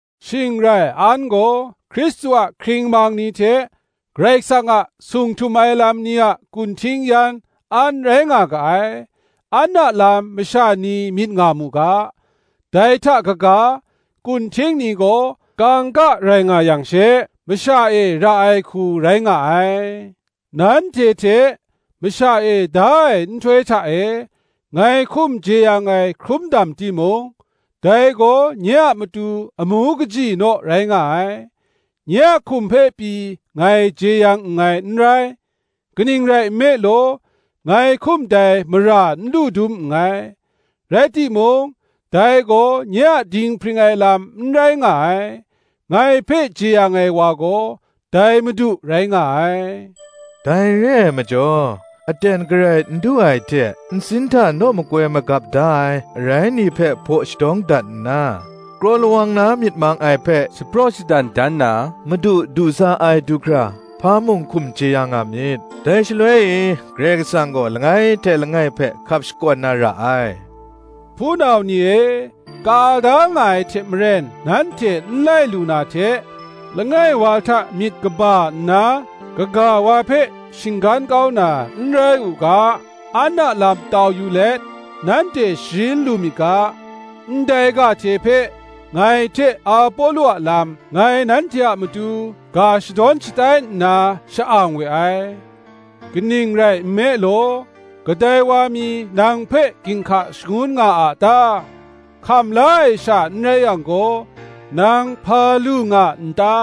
Shing rai an gaw Hkristu a hkringmang ni hte Karai Kasang a sung htum ai lam ni a kunhting yan an rai nga ga ai, an a lam masha ni myit nga mu ga. Dai hta kaga, kunhting ni gaw kangka rai nga yang she, masha e ra ai hku rai nga ai. Nanhte hte, masha e da ai nhtoi hta e, ngai hkum jeyang ai hkrum dam timung, dai gaw nye a matu amu kaji naw rai nga ai: nye a hkum hpe pyi ngai jeyang nngai n rai. Kaning rai nme law, ngai hkum dai mara n lu dum nngai: rai timung, dai gaw nye a dinghpring ai lam n rai nga ai: ngai hpe jeyang ai wa gaw, dai Madu rai nga ai. Dai re ai majaw, aten garai n du ai hte, nsin hta naw makoi magap da ai arai ni hpe hpaw shadawng dat nna, kraw lawang na myit mang ai hpe shapraw shadan dan na Madu du sa ai du hkra, hpa mung hkum jeyang nga myit; dai shaloi e Karai Kasang gaw langai hte langai hpe hkap shakawn na ra ai. Hpunau ni e, ka da nga ai hte maren nanhte n lai lu na hte, langai wa hta myit kaba nna kaga wa hpe shinggan kau na n rai u ga, an a lam tau yu let nanhte sharin lu myit ga, ndai ga hte hpe ngai hte Apolo a lam, ngai nanhte a matu ga shadawn shatai nna sha-ang we ai. Kaning rai nme law, kadai wa mi nang hpe ginhka shangun nga a ta? Hkam la ai sha n rai yang gaw, nang hpa lu nga a ta?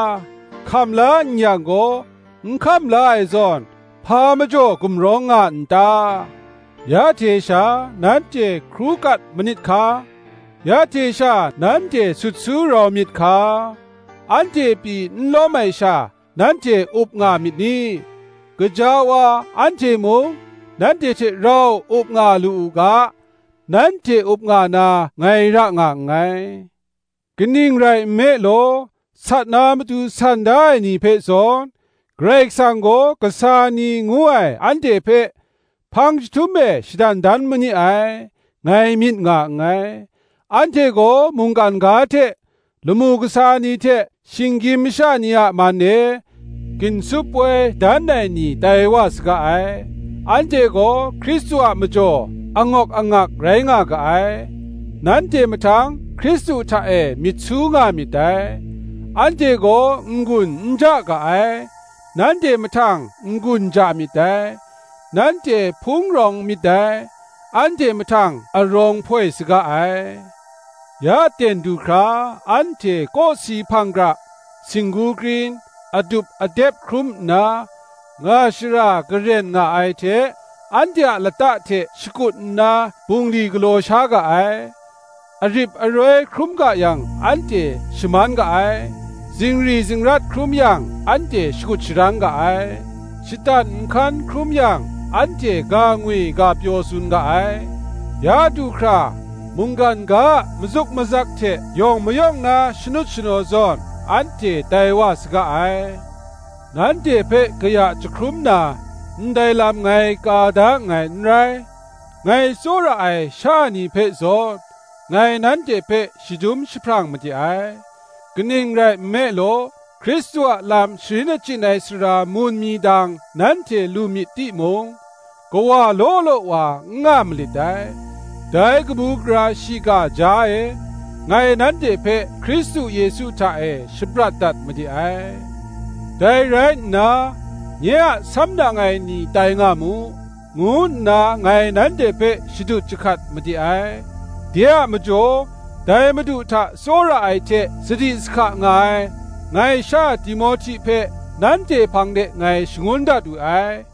Hkam la n yang gaw, n hkam la ai zawn, hpa majaw gumrawng nga n ta? Ya hte sha nanhte hkru kat manit hka; ya hte sha nanhte sut su rau myit hka; anhte pyi n lawm ai sha nanhte up nga myit ni? gaja wa, anhte mung nanhte hte rau up nga lu u ga, nanhte up nga na ngai ra nga nngai. Kaning rai nme law, sat na matu san da ai ni hpe zawn, Karai Kasang gaw kasa ni ngu ai anhte hpe hpang chyahtum e shadan dan ma ni ai, ngai myit nga nngai: anhte gaw mungkan ga hte, lamu kasa ni hte shinggyim masha ni a man e, ginsup poi dan ai ni tai wa saga ai. Anhte gaw Hkristu a majaw angawk angak rai nga ga ai, nanhte mahtang Hkristu hta e myit su nga myit dai; anhte gaw n-gun n ja ga ai, nanhte mahtang n-gun ja myit dai; nanhte hpung rawng myit dai, anhte mahtang arawng hpoi saga ai. Ya ten du hkra anhte kawsi hpang gara, singgu krin, adup adep hkrum nna, nga shara garen nga ai hte, anhte a lata hte shakut nna bungli galaw sha ga ai; arip aroi hkrum yang anhte shaman ga ai; zingri zingrat hkrum yang anhte shakut sharang ga ai; shatan nhkan hkrum yang anhte ga ngwi ga pyaw tsun ga ai; ya du hkra, mungkan ga a mazuk mazak hte yawng mayawng na shanut shanaw zawn, anhte tai wa saga ai. Nanhte hpe kaya jahkrum na, ndai lam ngai ka da nngai n rai; ngai tsawra ai sha ni hpe zawn ngai nanhte hpe shadum jahprang made ai. Kaning rai nme law, Hkristu a lam sharin achyin ai sara mun mi dang nanhte lu myit timung, kawa law law wa n nga malit dai; dai kabu gara shiga jaw e, ngai nanhte hpe Hkristu Yesu hta e shaprat dat made ai. Dai rai nna, nye a samnang ai ni tai nga mu, ngu nna ngai nanhte hpe shadut jahkat made ai. De a majaw, dai Madu hta tsawra ai hte sadi sahka nga ai, ngai sha Timohti hpe nanhte hpang de ngai shangun dat we ai;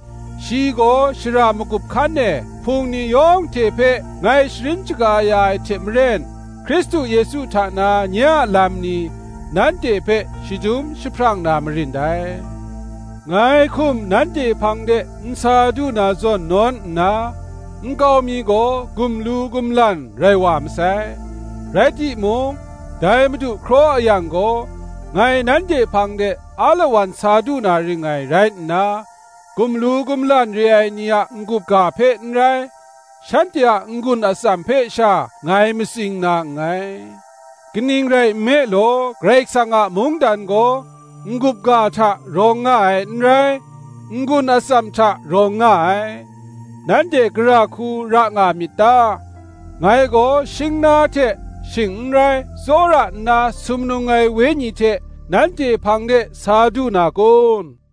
shi gaw, shara magup hkan e Hpung ni yawng hte hpe ngai sharin shaga ya ai hte maren, Hkristu Yesu hta na nye a lam ni, nanhte hpe shadum jahprang na marin dai. Ngai hkum nanhte hpang de n sa du na zawn nawn nna, nkau mi gaw gumlu gumlan rai wa masai. Rai timung, dai Madu hkraw a yang gaw, ngai nanhte hpang de alawan sa du na ring ngai rai nna, gumlu gumlan re ai ni a n-gup ga hpe n rai, shanhte a n-gun atsam hpe sha ngai matsing na nngai: kaning rai nme law, Karai Kasang a mungdan gaw n-gup ga hta rawng nga ai n rai, n-gun atsam hta rawng nga ai. Nanhte gara hku ra nga myit ta? Ngai gaw shingna hte, shing n rai, tsawra nna sumnung ai wenyi hte, nanhte hpang de sa du na kun?